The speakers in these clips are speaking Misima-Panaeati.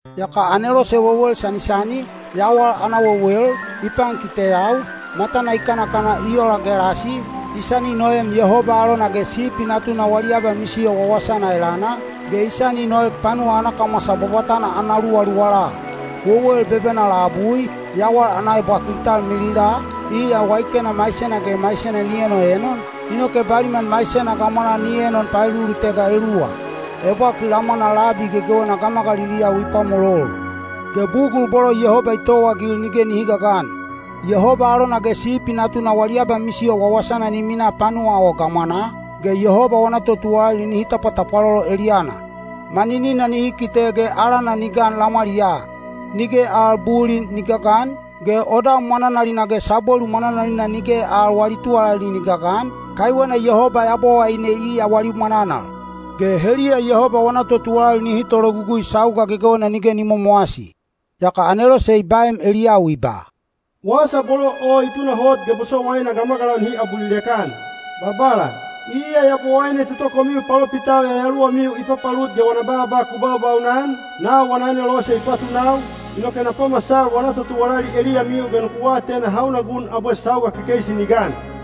Yaka anelose wewel sanisani, yawal ana wewel, i pankiteyau, matana i kanakana i ola gelasi, i sani noem Yehoba alona ge Sipi Natuna wali abamisiyo wawasana elana, ge i sani noek panuwa ana kamwasa bwabwatana ana luwaluwala. Wewel bebena labui, yawal ana ebwakil i talmilila, iya waikena maisena ge maisena ni enoenon, inoke baliman maisena gamwanaa ni enon paelulutega eluwa. Ebwakil lamwana labi gegewena gamagaliliyau i pwamolol. Ge bugul bolo Yehoba i towaagil nige nihi gagan. Yehoba alona ge Sipi Natuna wali abamisiyo wawasana ni minaa panuwa o gamwanaa, ge Yehoba wana totuwalali nihi tapwatapwalolo eliyana. Maninina nihi kite ge alana ni gan lamwaliyaa. Nige al bulin ni gagan, ge odam mwananalina ge sabwelu mwananalina nige al wali tuwalali ni gagan, kaiwena Yehoba Yabowaine iya wali mwananal. Ge heliya Yehoba wana totuwalali nihi tologugui sauga gegewena nige ni momowasi. Yaka anelose i baem eliyau i ba, “Wasa bolo o hi tunahot ge bosowaina gamagalau nihi abulilek-an. Babala, iya Yabowaine toto komiu palopitau yayaluwamiu i papalut ge wana baaba ku baubaunan, nau wana anelose i patunau, inoke na pamasal wana totuwalali eliyamiu ge nuku atena hauna gun abwe sauga kekeisi ni gan.”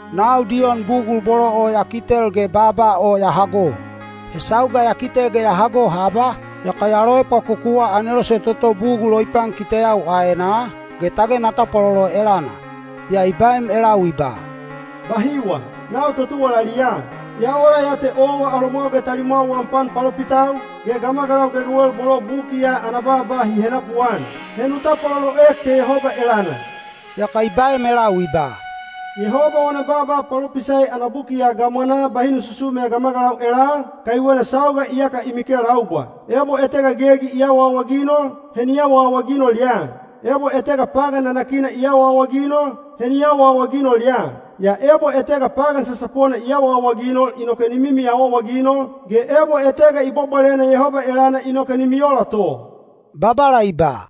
Nau Diyon bugul bolo o ya kitel ge baaba o ya hago. He sauga ya kite ge ya hago haba, yaka ya loepwakokuwa anelose toto bugul o i pankiteyau aenaa, ge tage na tapwalolo elana. Yaa i baem elau i ba, “Bahiwa! Nau totuwalali ya, ya ola ya te owa alomwau ge talimwau wam pan palopitau, ge gamagalau gegewel bolo buki ya ana baaba hi henapuan. He nu tapwaloloek te Yehoba elana!” Yaka i baem elau i ba, “Yehoba wana baaba palopisai ana buki ya gamwanaa bahi nu susume gamagalau elal, kaiwena sauga iyaka i mikelaubwa. Ebo etega gegi i awaawaginol, he ni awaawaginol ya! Ebo etega pagan nanakina i awaawaginol, he ni awaawaginol ya! Yaa ebo etega pagan sasapona i awaawaginol inoke ni mimi awaawaginol, ge ebo etega i bwabwalena Yehoba elana inoke ni miola to.” Babala i ba,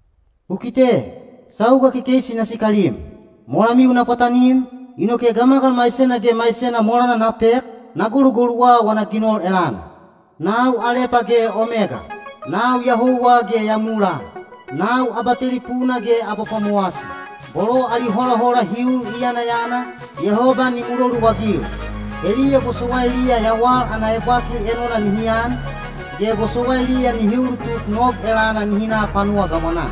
“Ku kite! Sauga kekeisi na sikalim. Molamiu na pwatanim, inoke gamagal maisena ge maisena molana na pek, na golugoluwa wana ginol elana. Nau Alepa ge Omega. Nau ya houwa ge ya mulaa. Nau Abatelipuna ge Abapwamowasi. “Bolo ali holahola hi ul i yanayana, Yehoba ni muloluagil. Heliya bosowailiya yawal ana ebwakil enona nihi an, ge bosowailiya nihi ulutuk nog elana nihi na panuwa gamwanaa.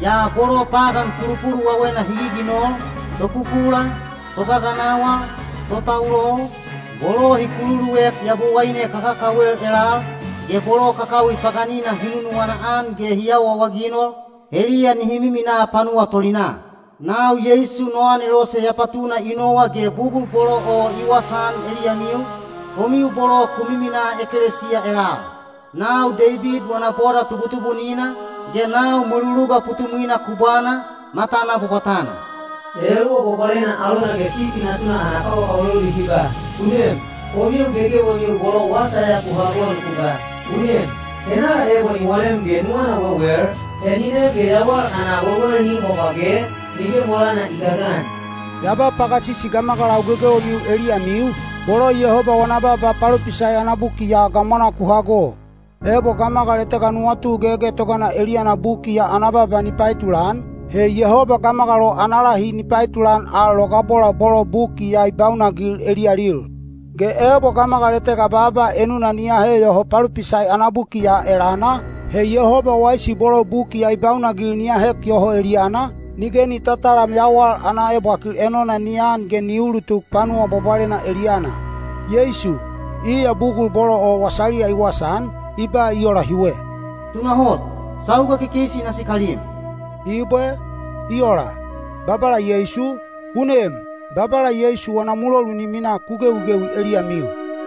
Yaa bolo pagan pulupuluwawena hi giginol, tokukula, togaganawal, totaulol, bolo hi kululuek yabowaine kakakawel elal, ge bolo kakawi paganina hi nunuwana-an ge hi awaawaginol, heliya nihi miminaa panuwa tolinaa. “Nau Yeisu no anelose ya patuna i nowa ge bugul bolo o i wasaan eliyamiu, komiu bolo ku miminaa ekelesiya elal. Nau Deibid wana boda tubutubunina, ge nau mweluluga putumwina kubwana, matana bwabwatana.” Yayaluwa Bwabwalena alona ge Sipi Natuna ana kawakawalolu hi ba, “U nem!” Komiu gegewemiu bolo wasa ya ku hago nuku ba, “U nem!” Henala ebo ni walem ge nuwana wewel, he ni nem ge yawal ana wewel ni im bwabwage, nige molana i gagan. Ya ba pagasisi gamagalau gegewemiu eliyamiu, bolo Yehoba wana baaba palopisai ana buki ya gamwanaa ku hago. Ebo gamagal etega nuwatu gegetogana eliyana buki ya ana baaba ni paetulan, he Yehoba gamagal o ana lahi ni paetulan al logabola bolo buki ya i baunagil eliyalil. Ge ebo gamagal etega baaba enuna ni ahe yoho palopisai ana buki ya elana, he Yehoba waisi bolo buki ya i baunagil ni ahek yoho eliyana, nige ni tatalam yawal ana ebwakil enona ni an ge ni ulutuk panuwa bwabwalena eliyana. Yeisu, iya bugul bolo o wasaliya i wasaan, i ba i ola hiwe: “Tunahot, sauga kekeisi na sikalim.” Ibwe. I ola! Babala Yeisu, u nem! Babala Yeisu wana mulolu ni minaa ku gewigewi eliyamiu.